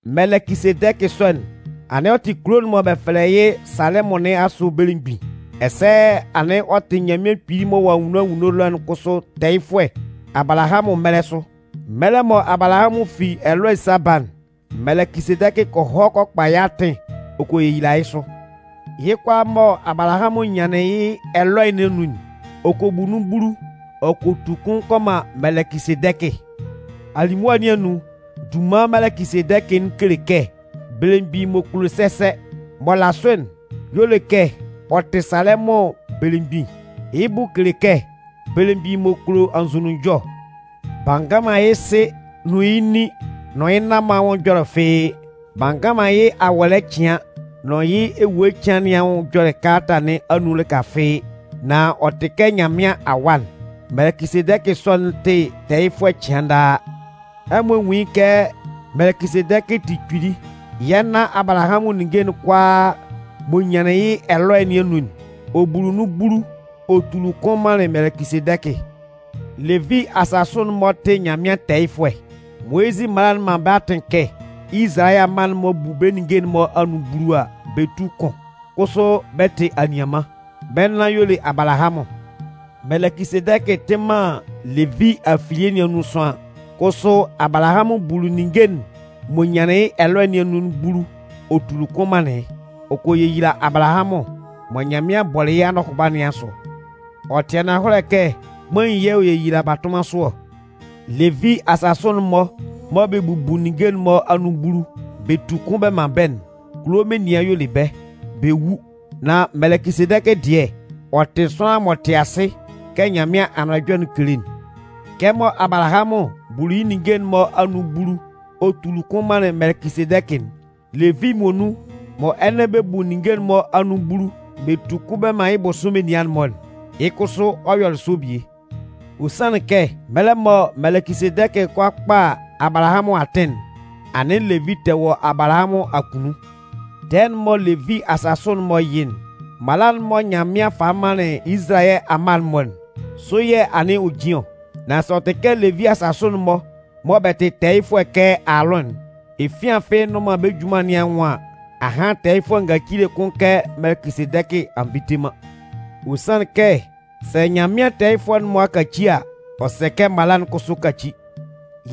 Mɛlɛkɩsedɛkɩ sɔ'n, anɩn ɔ tɩ kulo'n mɔ bɛ fɛlɛ yɩ́ Salɛmʋn nɩn asʋ belemgbin. Ɛsɛ anɩn ɔ tɩ Nyanmɩan Kpili m'ɔ wɔ anwunno anwunno ɛlɔ'n kʋsʋ tɛɛyɩfʋɛ Abalahamʋn mɛlɛ sʋ. Mɛlɛ mɔ Abalahamʋn fi ɛlɔɛ ɔ 'sa ba'n, Mɛlɛkɩsedɛkɩ kɔ hɔ kɔ kpa yɩ́ atɩn ɔ kɔ yeyila yɩ́ sʋ. Yɩ́ kʋalaa mɔ Abalahamʋn nyanlɩn yɩ́ ɛlɔɛ nɩn anun'n, ɔ kɔ bu nun bulu. Ɔ kɔ tu kʋn kɔ man Mɛlɛkɩsedɛkɩ. Alimʋa nɩn anun, dunman Mɛlɛkɩsedɛkɩ'n kele kɛ: “belemgbin m'ɔ kulo sɛsɛ.” M'ɔ la sʋ'n, y'ɔ le kɛ ɔ tɩ Salɛmʋn belemgbin. Yɩ́ bʋ kele kɛ: “belemgbin m'ɔ kulo anzʋnunjɔ.” B'a ngan man yɩ́ sɩ nʋn yɩ́ nin nʋn yɩ́ nan-mɔ anwʋn ɛjɔlɛ fɩ́ɩ́. B'a ngan man yɩ́ awɔlɛ cɩan nʋn yɩ́ ewue cɩan nɩn anwʋn ɛjɔlɛ kalata nɩn anun lɩka fɩ́ɩ́. Nan ɔ tɩ kɛ Nyanmɩan Awa'n. Mɛlɛkɩsedɛkɩ sɔ'n tɩ tɛɛyɩfʋɛ cɩan daa. Ɛmɔ nwún yɩ́ kɛ Mɛlɛkɩsedɛkɩ tɩ kpili. Yɛ́ nan Abalahamʋn ninnge'n kʋalaa m'ɔ nyanlɩn yɩ́ ɛlɔɛ nɩn anun'n, ɔ buli nun bulu ɔ tuli kʋn manlɩn Mɛlɛkɩsedɛkɩ. Levi asasʋ'n-mɔ tɩ Nyanmɩan tɛɛyɩfʋɛ. Moyizɩ mala'n man bɛ́ atɩn kɛ Izalayɛ amma'n-mɔ bu bɛ́ ninnge'n-mɔ anun bulu a, bɛ tú kʋn. Kʋsʋ bɛ́ tɩ anianman, bɛ́ nan y'ɔ le Abalahamʋn. Mɛlɛkɩsedɛkɩ tɩ man Levi afilie nɩn anun sʋanlan. Kʋsʋ Abalahamʋn buli ninnge'n m'ɔ nyanlɩn yɩ́ ɛlɔɛ nɩn anun'n bulu ɔ tuli kʋn manlɩn yɩ́. Ɔ kɔ yeyila Abalahamʋn mɔ Nyanmɩan bɔlɩ yɩ́ anɔhʋba nɩn asʋ. Ɔ tɩ ananhɔlɛ kɛ kpain yɛ̂ ɔ yeyila batʋnman sʋ ɔ. Levi asasʋ'n-mɔ mɔ bɛ bubu ninnge'n-mɔ anun bulu, bɛ tu kʋn bɛ man bɛ́'n, kulo menian y'ɔ le bɛ́. Bɛ wu. Nan Mɛlɛkɩsedɛkɩ dɩɛ, ɔ tɩ sʋanlan m'ɔ tɩ asɩ kɛ Nyanmɩan Anʋan Ɛjɔlɛ'n kele'n. Kɛmɔ Abalahamʋn buli yɩ́ ninnge'n-mɔ anun bulu ɔ tuli kʋn manlɩn Mɛlɛkɩsedɛkɩ'n, Levi muonun mɔ ɛnɛ bɛ bu ninnge'n-mɔ anun bulu bɛ tu kʋn bɛ man yɩ́ bʋsʋ menian'n-mɔ'n, yɩ́ kʋsʋ ɔ yɔlɩ sɔ bie. Ɔ sanlɩn kɛ mɛlɛ mɔ Mɛlɛkɩsedɛkɩ 'kɔ a kpa Abalahamʋn atɩn'n, anɩn Levi tɛ wɔ Abalahamʋn akunnun. Tɛɛ'n mɔ Levi asasʋ'n-mɔ yɩ'n, mala'n mɔ Nyanmɩan falɩ manlɩn Izalayɛ amma'n-mɔ'n, sʋ yɛ̂ anɩn ɔ jin ɔ. Nan sɛ ɔ tɩ kɛ Levi asasʋ'n-mɔ mɔ bɛ tɩ tɛɛyɩfʋɛ kɛ Aalʋn'n, efian fɩ́ɩ́ nnʋn man bɛ́ junman nɩn anwʋn an, ahan tɛɛyɩfʋɛ ngacile kʋn kɛ Mɛlɛkɩsedɛkɩ a nvite man. Ɔ sanlɩn kɛ sɛ Nyanmɩan tɛɛyɩfʋɛ'n-mɔ a kaci a, ɔ sɛ kɛ mala'n kʋsʋ káci.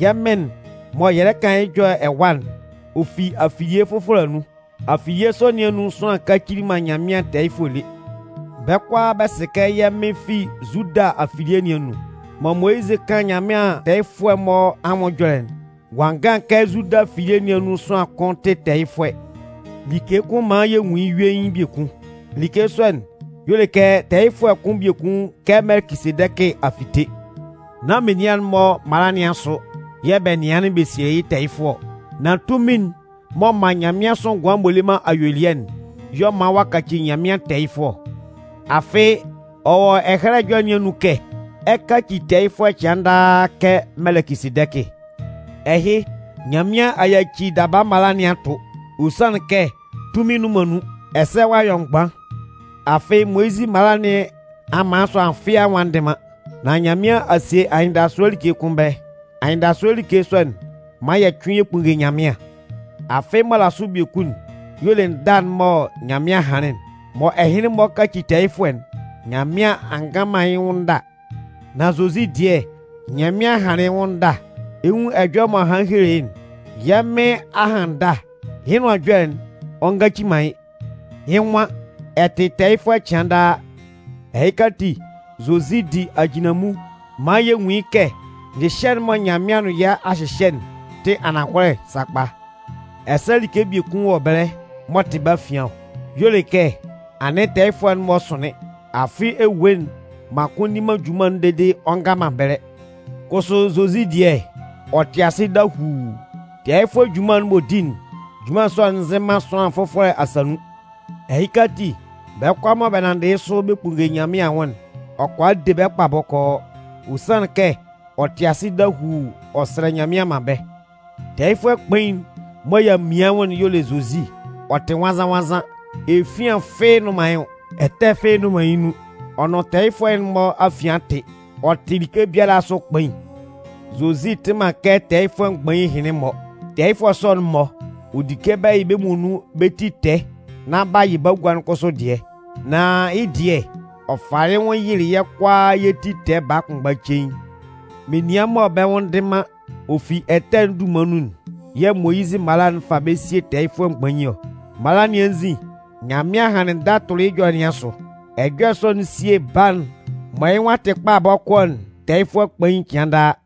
Yɛ́ Mɩn'n mɔ yɛ lɛ kan yɩ́ nwʋn ɛjɔlɛ ɛwa'n, ɔ fi afilie fʋfɔlɛ anun. Afilie sɔ nɩn anun sʋanlan kacili man Nyanmɩan tɛɛyɩfʋɛ lé. Bɛ́ kʋalaa bɛ sɩ kɛ yɛ́ Mɩn fi Zuda afilie nɩn anun. Mɔ Moyizɩ 'kan Nyanmɩan tɛɛyɩfʋɛ'n-mɔ anwʋn ɛjɔlɛ'n, ɔ'a ngan kɛ Zuda afilie nɩn anun sʋanlan kʋn tɩ tɛɛyɩfʋɛ. Like kʋn man yɛ nwun yɩ́ yuein biekun. Like sɔ'n y'ɔ le kɛ tɛɛyɩfʋɛ kʋn biekun kɛ Mɛlɛkɩsedɛkɩ a fite. Nán menian'n-mɔ mala nɩn asʋ yɛ̂ bɛ nɩanlɩn bɛ sielɩ yɩ́ tɛɛyɩfʋɛ ɔ. Nan tunmin'n m'ɔ man nyanmɩansʋ ngʋan m'ɔ le man ayuelɩɛ'n, y'ɔ man ɔ'a kaci Nyanmɩan tɛɛyɩfʋɛ ɔ. Afɩ ɔ wɔ Ɛhɛlɛ Ɛjɔlɛ nɩn anun kɛ: Ɛ 'kaci tɛɛyɩfʋɛ cɩan daa kɛ Mɛlɛkɩsedɛkɩ. Ɛhɩ Nyanmɩan a yaci daba mala nɩn a tʋ. Ɔ sanlɩn kɛ tunmin nnʋn man nun, ɛsɛ ɔ'a yɔ mgban. Afɩ Moyizɩ mala nɩn a man sʋanlan fɩ́ɩ́ anwʋn a ndɩ man. Nan Nyanmɩan a sie anyɩndasʋɛ like kʋn ɛbɛlɛ. Anyɩndasʋɛ like sɔ'n man yɛ cʋɩn yɛ kpunnge Nyanmɩan. Afɩ m'ɔ la sʋ biekun'n y'ɔ le ndâ'n mɔ Nyanmɩan hanlɩn'n. Mɔ ɛhɩnlɩn-mɔ 'kaci tɛɛyɩfʋɛ'n, Nyanmɩan a ngan man yɩ́ nwʋn ndâ. Nan Zozi dɩɛ, Nyanmɩan hanlɩn yɩ́ nwʋn ndâ. Ɛ 'nwun ɛjɔlɛ m'ɔ hanlɩn helelɩ yɩ́'n: Yɛ́ Mɩn a han ndâ, Yɩ́ Nʋan Ɛjɔlɛ'n, ɔ ngaci man yɩ́. Yɩ́ nwan: Ɛ tɩ tɛɛyɩfʋɛ cɩan daa. Ɛhɩka ati, Zozi di ajinlanmun maan yɛ nwun yɩ́ kɛ nyɩhyɛ'n mɔ Nyanmɩan nʋn yɛ́ a hyɩhyɛ'n tɩ ananhɔlɛ sakpa. Ɛsɛ like biekun wɔ ɛbɛlɛ m'ɔ tɩ bɛ́ afian ɔ. Y'ɔ le kɛ anɩn tɛɛyɩfʋɛ'n-mɔ sʋnlɩn. Afɩ ewue'n man kʋn nni man junman'n dede ɔ nga man ɛbɛlɛ. Kʋsʋ Zozi dɩɛ, ɔ tɩ asɩ dahuu. Tɛɛyɩfʋɛ junman'n m'ɔ di'n, junman sɔ'n nzɩn man sʋanlan fʋfɔlɛ asa nun. Ɛhɩka ati, bɛ́ kʋalaa mɔ bɛ nanndɩ yɩ́ sʋ bɛ kpunnge Nyanmɩan anwʋn'n, ɔ kʋala de bɛ́ kpa bɔkɔɔ. Ɔ sanlɩn kɛ ɔ tɩ asɩ dahuu ɔ sɛlɛ Nyanmɩan man bɛ́. Tɛɛyɩfʋɛ kpain'n mɔ y'a mian yɩ́ nwʋn'n y'ɔ le Zozi. Ɔ tɩ nwannzan-nwannzan, efian fɩ́ɩ́ nnʋn man yɩ́ nwʋn. Ɛtɛ fɩ́ɩ́ nnʋn man yɩ́ nun. Ɔ nʋn ɛtɛfʋɛ'n-mɔ afian tɩ. Ɔ tɩ like biala asʋ kpain. Zozi tɩ man kɛ tɛɛyɩfʋɛ mgbain ɛhɩnlɩn-mɔ. Tɛɛyɩfʋɛ sɔ'n-mɔ, ɔ di kɛ bɛ yɩ bɛ́ muonun bɛ́ ti tɛɛ nán b'a yɩ bagua'n kʋsʋ dɩɛ. Nan yɩ́ dɩɛ, ɔ falɩ yɩ́ nwʋn yɩlɩ yɛ́ kʋalaa yɛ́ ti tɛɛ baa kʋnmgba cein. Menian mɔ bɛ́ nwʋn ndɩ man, ɔ fi ɛtɛ'n dunman nun'n yɛ̂ Moyizɩ mala'n fa bɛ́ sie tɛɛyɩfʋɛ mgbain ɔ. Mala nɩn anzin, Nyanmɩan hanlɩn ndâ tʋlɩ yɩ́ ɛjɔlɛ nɩn asʋ. Ɛjɔlɛ sɔ'n sie Baa'n mɔ yɩ́ nwʋn a tɩ kpa bɔkɔɔ'n tɛɛyɩfʋɛ kpain cɩan daa.